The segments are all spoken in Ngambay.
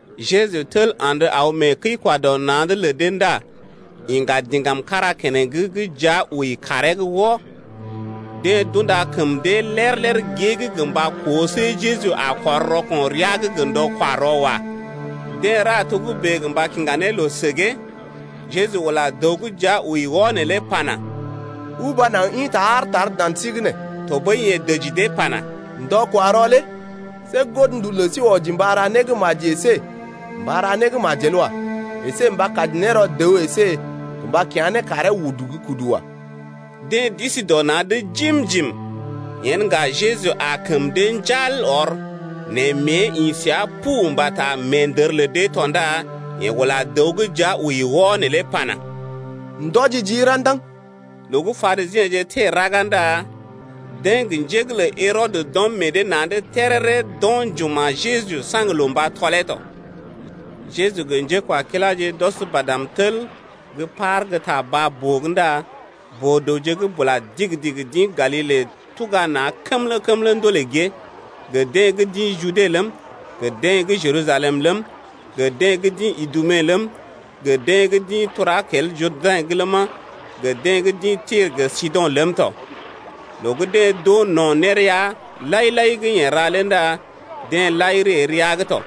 Jeju tel andə aw mee kəi-kwa-dɔ-na̰’d lə dee ndá iŋga diŋgam kára keneŋ gə́ jia wəi kaaree’g wɔ. Deḛ d’unda kəm dee lér-lér gée’g gə mba koo see Jeju a kɔr rɔko̰ rəa’g gə ndɔ-kwa-rɔ wa. Deḛ ra togə́bè gə mba kiŋga ne loo səgee ne. Jeju ula dəw gə́ jia wəi wɔ neelé pana: Uba naŋg ḭta aar tar dan sí’g nee. Tɔɓəi yeḛ dəji dee pana: Ndɔ-kwa-rɔ lé see godndu lə sí wɔji mba ra né gə́ maji əsé mba ra né gə́ majel wa. Esé gə mba kaji ne rɔ dəw əsé gə mba kya̰ ne karee udu gə́ kudu wa. Deḛ d’isi dɔ na̰’d jim-jim. Yen ŋga Jeju aa kəm dee njal ɔr, nɛ mée ḭ səa pu mbata meendər lə dee tɔ ndá yeḛ ula dəw gə́ jia wəi wɔ neelé pana: Ndɔji jii ra̰daŋ. Loo gə́ Parisiḛje teḛ raga ndá deḛ gə njé’g lə Herɔdə d’ɔm meḛ dee na̰’d téréré d’o̰ njuma̰ Jeju saŋg loo mba tɔlee tɔ. Jeju gə njékwakiláje d’ɔs badm tel gə́ par gə́ ta baa-boo’g ndá boo-dəwje gə́ bula digi-digi d’ḭ Galile tuga na̰ kəmlə-kəmlə ndolè gée, gə deḛ gə́ d’ḭ Jude ləm, gə deḛ gə́ Jerusalem ləm, gə deḛ gə́ d’ḭ Idume ləm, gə deḛ gə́ d’ḭ tura kel Jurdɛ̰’g ləma, gə deḛ gə́ d’ḭ Tir gə Sido̰ ləm tɔ. Loo gə́ deḛ d’oo no̰ nérea lai-lai gə́ yeḛ ra lé ndá deḛ lai ree rəa’g tɔ.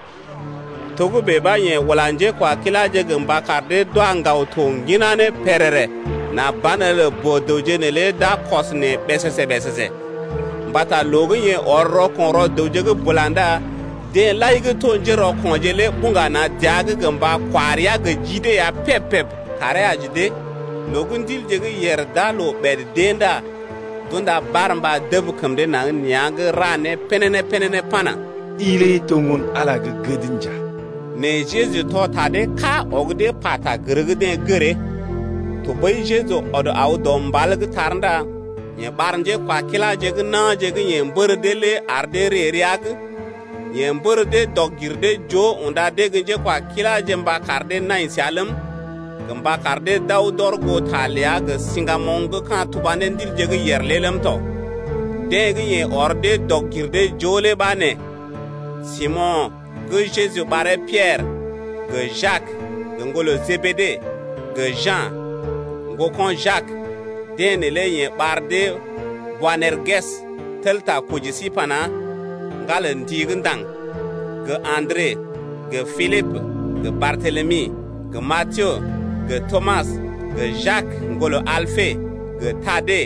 Togə́bè ɓa yeḛ ula njékwakiláje gə mba kar dee d’wa ŋgaw to ŋginá ne pèrèrè nà banelə boo-dəwje neelé d’a kɔs neḛ ɓèsèsè-ɓèsèsè. Mbata loo gə́ yeḛ ɔr rɔko̰ rɔ dəwje bula ndá deḛ lai gə́ to njérɔko̰je lé buŋga na̰ dəa’g gə mba kwa rəa gə ji dee ya peb-peb karee aji dee. Loo gə́ ndilje gə́ yèr d’aa loo ɓèd d’ée ndá d’unda barmba dəb kəm dee naŋg nea̰’g ra né pénéné-pénéné pana: I lé to Ŋgon-Ala gə́ gəd nja. Nɛ Jeju tɔ ta dee ká ɔg dee pata gər gə́ deḛ gəree. Tɔɓəi Jeju ɔd aw dɔ mbal’g tar ndá yeḛ ɓar njékwakiláje gə́ na̰je gə́ yeḛ mbər dee lé ar dee ree rəa’g. Yeḛ mbər dee dɔg-gir-dee-joo unda dee gə́ njékwakiláje mba kar dee nai səa ləm, gə mba kar dee d’aw d’ɔr goo ta ləa gə siŋgamoŋ gə́ ka̰ tuba ne ndilje gə́ yèr lé ləm tɔ. Deḛ gə́ yeḛ ɔr dee dɔg-gir-dee-joo lé ɓa nee: Simo̰ gə́ Jeju ɓaree Piɛrə, gə Jak, ŋgolə Jebede, gə Ja̰, ŋgoko̰ Jak, deḛ neelé yeḛ ɓar dee Boanerges, tel ta koji sí pana: Ŋgan lə ndi-gə́-ndaŋg: gə Andre, gə Pilibə, gə Bartelemi, gə Matiyo, gə Tomas, gə Jak, ŋgolə Alpe, gə Tade,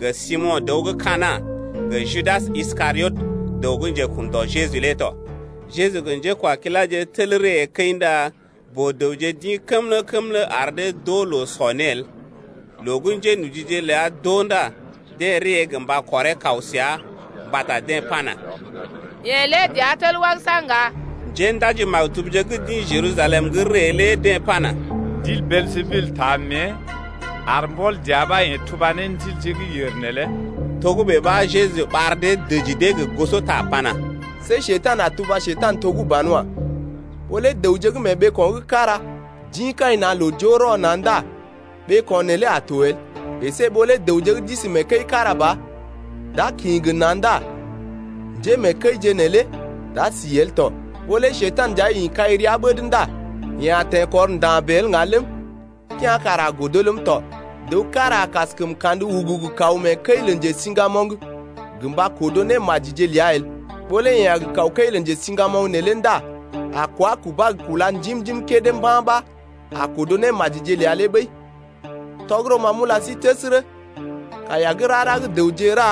gə Simo̰ dəw gə́ Kana̰, gə Judas Iskariot, dəw gə́ njekun dɔ Jeju lé tɔ. Jeju gə njékwakiláje tel ree kəi ndá boo-dəwje d’ḭ kəmlə-kəmlə ar dee d’oo loo sɔ né el. Loo gə́ njénojije ləa d’oo ndá deḛ ree gə mba kɔree kaw səa, mbata deḛ pana: Yeḛ lé dəa tel wagəsa ŋga. Njéndaji-maktubje gə́ d’ḭ Jerusalem’g ree lé deḛ pana: Ndil Beeljebul taa mée, ar mbɔl dəa ɓa yeḛ tuba ne ndilje gə́ yèr neelé. Togə́bè ɓa Jeju ɓar dee dəji dee gə gosota pana: See Njekurai a tuba Njekurai to gə́ banwa. Ɓó lé dəwje gə́ mee ɓeeko̰ gə́ kára d’ḭ kai na̰ loo joo rɔ na̰ ndá ɓeeko̰ neelé a to el, əsé ɓó lé dəwje gə́ d’isi mee kəi gə́ kára ba d’a kḭ gə na̰ ndá njémeekəije neelé d’a si el tɔ. Ɓó lé Njekurai nja ḭ kai rəa ɓəd ndá yeḛ a teḛkɔr nda̰ bèe el ŋga ləm, kea̰ kara a godo ləm tɔ. Dəw kára a kaskəm kandə ugugu kaw mee kəi lə njesiŋgamoŋ gə mba kodo némajije ləa el. Ɓó lé yeḛ a gə kaw kəi lə njesiŋgamoŋ neelé ndá a kwá kubá gə kúla njim-njim kédé mba̰ ɓa a kodo némajije ləa lé ɓəi. Tɔgərɔ ma m’ula sí təsərə, kaiya gə́ rara gə́ dəwje ra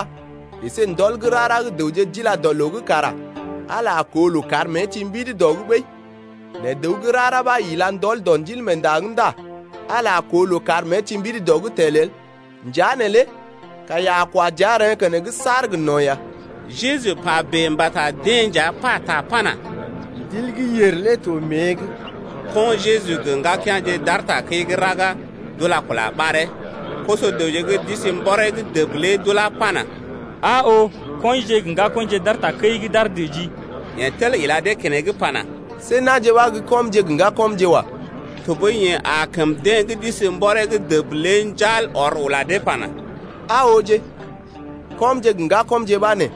əsé ndɔl gə́ rara gə́ dəwje d’ila dɔ loo’g kara Ala a koo loo kar mée ti mbidi dɔ’g ɓəi. Nɛ dəw gə́ rara ɓa ila ndɔl dɔ Ndilmeenda’g ndá Ala a koo loo kar mée ti mbidi dɔ’g tel el. Njea neelé kaiya a kwa dəa, reḛ́ keneŋ saar gə no̰ ya. Jeju pa bèe mbata deḛ nja pata pana: Ndil gə́ yèr lé to mée’g. Ko̰ Jeju gə ŋgakea̰je d’aar takəi gə́ raga, d’ula kula ɓaree. Koso-dəwje gə́ d’isi mbɔree’g dəb lé d’ulá pana: Aa oo, kɔinje gə ŋgakɔḭje d’aar takəi’g d’aar dəjii. Yeḛ tel ila dee keneŋ pana: See na̰je ɓa gə́ kɔmje gə ŋgakɔmje wa. Tɔɓəi yeḛ aa kəm deḛ gə́ d’isi mbɔree’g dəb lé njal ɔr ula dee pana: Aa ooje, kɔmje gə ŋgakɔmje ɓa nee.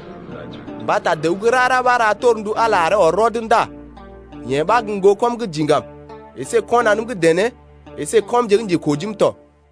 Mbata dəw gə́ rara ɓa ra torndu Ala lé aree ɔr rɔd ndá yeḛ ɓa gə́ ŋgokɔm gə́ diŋgam əsé kɔnanəm gə́ dené əsé kɔmje gə́ njekojim tɔ.